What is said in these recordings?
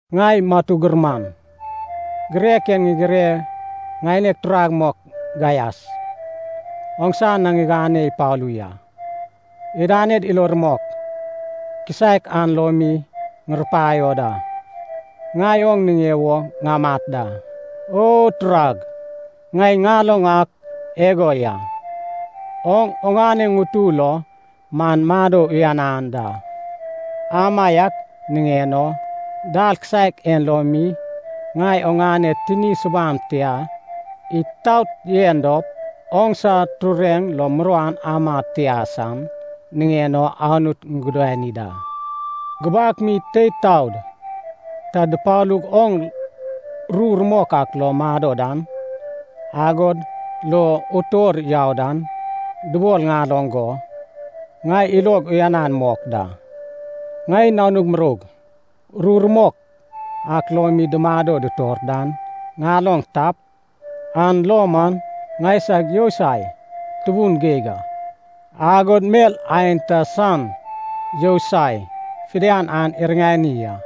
Ŋai matu gurman, girek en ŋigireg ŋaineg turag mok Gaias, oŋsa na ŋigane ipalu ya. Idaned ilo rumok kisaek an lo mi ŋurupaio da, ŋai oŋ niŋe wo ŋamat da. O turag, ŋai ŋaloŋ ak igo ya, oŋ oŋane ŋutu lo man mado uyanan da. Amaiak niŋen o, dal kisaek en lo mi ŋai oŋane tini subam tia itaot yen dop, oŋsa tureŋ lo muruan ama tia san niŋen o Anut ŋugudani da. Gubak mi teid taod ta dupalug oŋ ru rumok ak lo mado dan, agod lo utor yau dan dubol ŋaloŋ go, ŋai ilog uyanan mok da. Ŋai nanug muroug ru rumok ak lo mi dumado dutor dan ŋaloŋ tap, an lo man ŋaisag yousai tubun geig a, agod mel aenta san yousai fidian an iriŋanai a.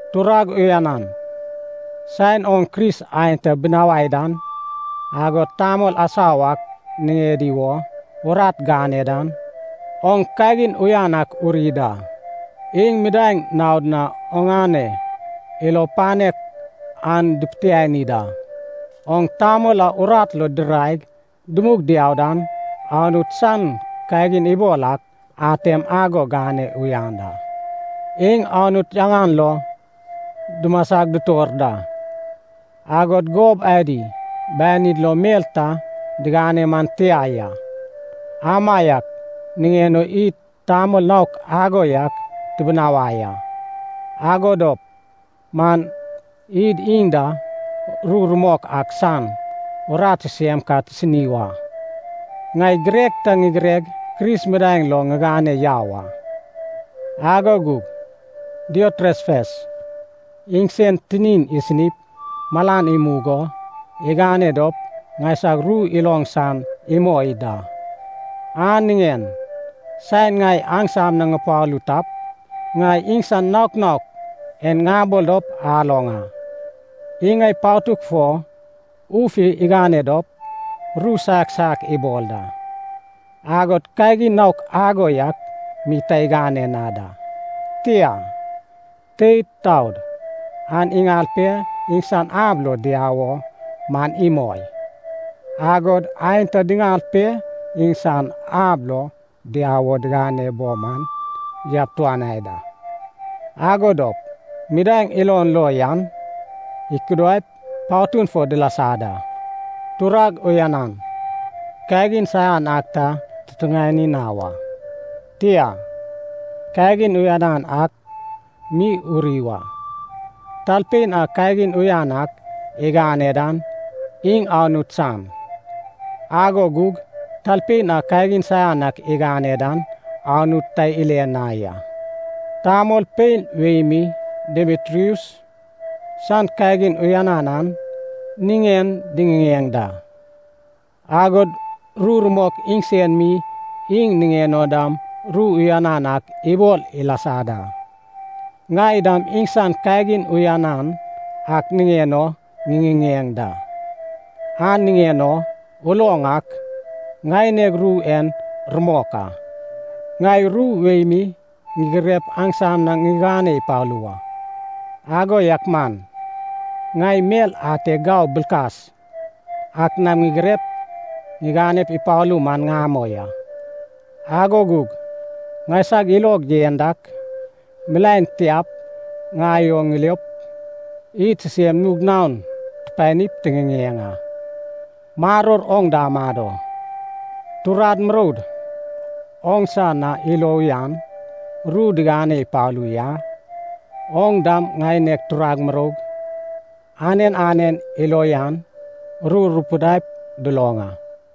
Turag uyanan, saen oŋ Kris aenta binawai dan, agod tamol asau ak niŋedi wo urat gane dan, oŋ kagin uyan ak uri da. Iŋ midaeŋ naod na oŋane ilo panek an dupitiani da. Oŋ tamol a urat lo diraig dumug diau dan, Anut san kagin ibol ak atem ago gane uyan da. Iŋ Anut yaŋan lo dumasag dutor da, agod gob adi banid lo mel ta diŋane man tia ya. Amaiak niŋen o id tamol naok ago yak tibinawai a, ago dop man id iŋ da ru rumok ak san urat sisem ka tisini wa. Ŋai girek ta ŋigireg Kris midaeŋ lo ŋigane yau a. Ago gug Diotrefes iŋsen tinin isinip malan imug o igane dop ŋaisag ru iloŋ san imoi da. An niŋen saen ŋai aŋsam na ŋupalu tap, ŋai iŋsan naok naok en ŋabol dop aloŋ a. Iŋ ŋai patug fo uf igane dop ru saiak saiak ibol da. Agod kagin naok ago yak mi ta igane na da, tia, teid taod an iŋal pe iŋsan ab lo diau o man imoi. Agod aenta diŋal pe iŋsad ab lo diau wo digane bo man yabtuanai da, ago dop midaeŋ ilon lo yan ikudaip patun fo dilasa da. Turag uyanan, kagin saian ak ta tutuŋani na wa, tia, kagin uyan ak mi uri wa. Talpein a kagin uyan ak igane dan iŋ Anut san, ago gug talpein a kagin saian ak igane dan Anut ta ile na ya. Tamolpein wei mi Demitrius san kagin uyanan an niŋen diŋiŋeŋ da. Agod ru rumok iŋsen mi iŋ niŋen o dam ru uyanan ak ibol ilasa da. Ŋai dam iŋsan kagin uyanan ak niŋen o ŋiŋiŋeŋ da, an niŋen o uloŋ ak ŋaineg ru en rumok a. Ŋai ru wei mi ŋigirep aŋsam na ŋigane ipalu wa, ago yak man ŋai mel ate gau bilkas ak nam ŋigirep ŋigane ipalu man ŋamoi a. Ago gug ŋaisag ilog yen dak, milaen tiap ŋai oŋ ŋiliop id sisem nug naon tupanip tiŋiŋeŋ a. Maror oŋ da amado. Turad muroud oŋsa na ilo uyan ru digane ipalu ya. Oŋ dam ŋaineg turag muroug anen anen ilo uyan ru rupidaip duloŋ a.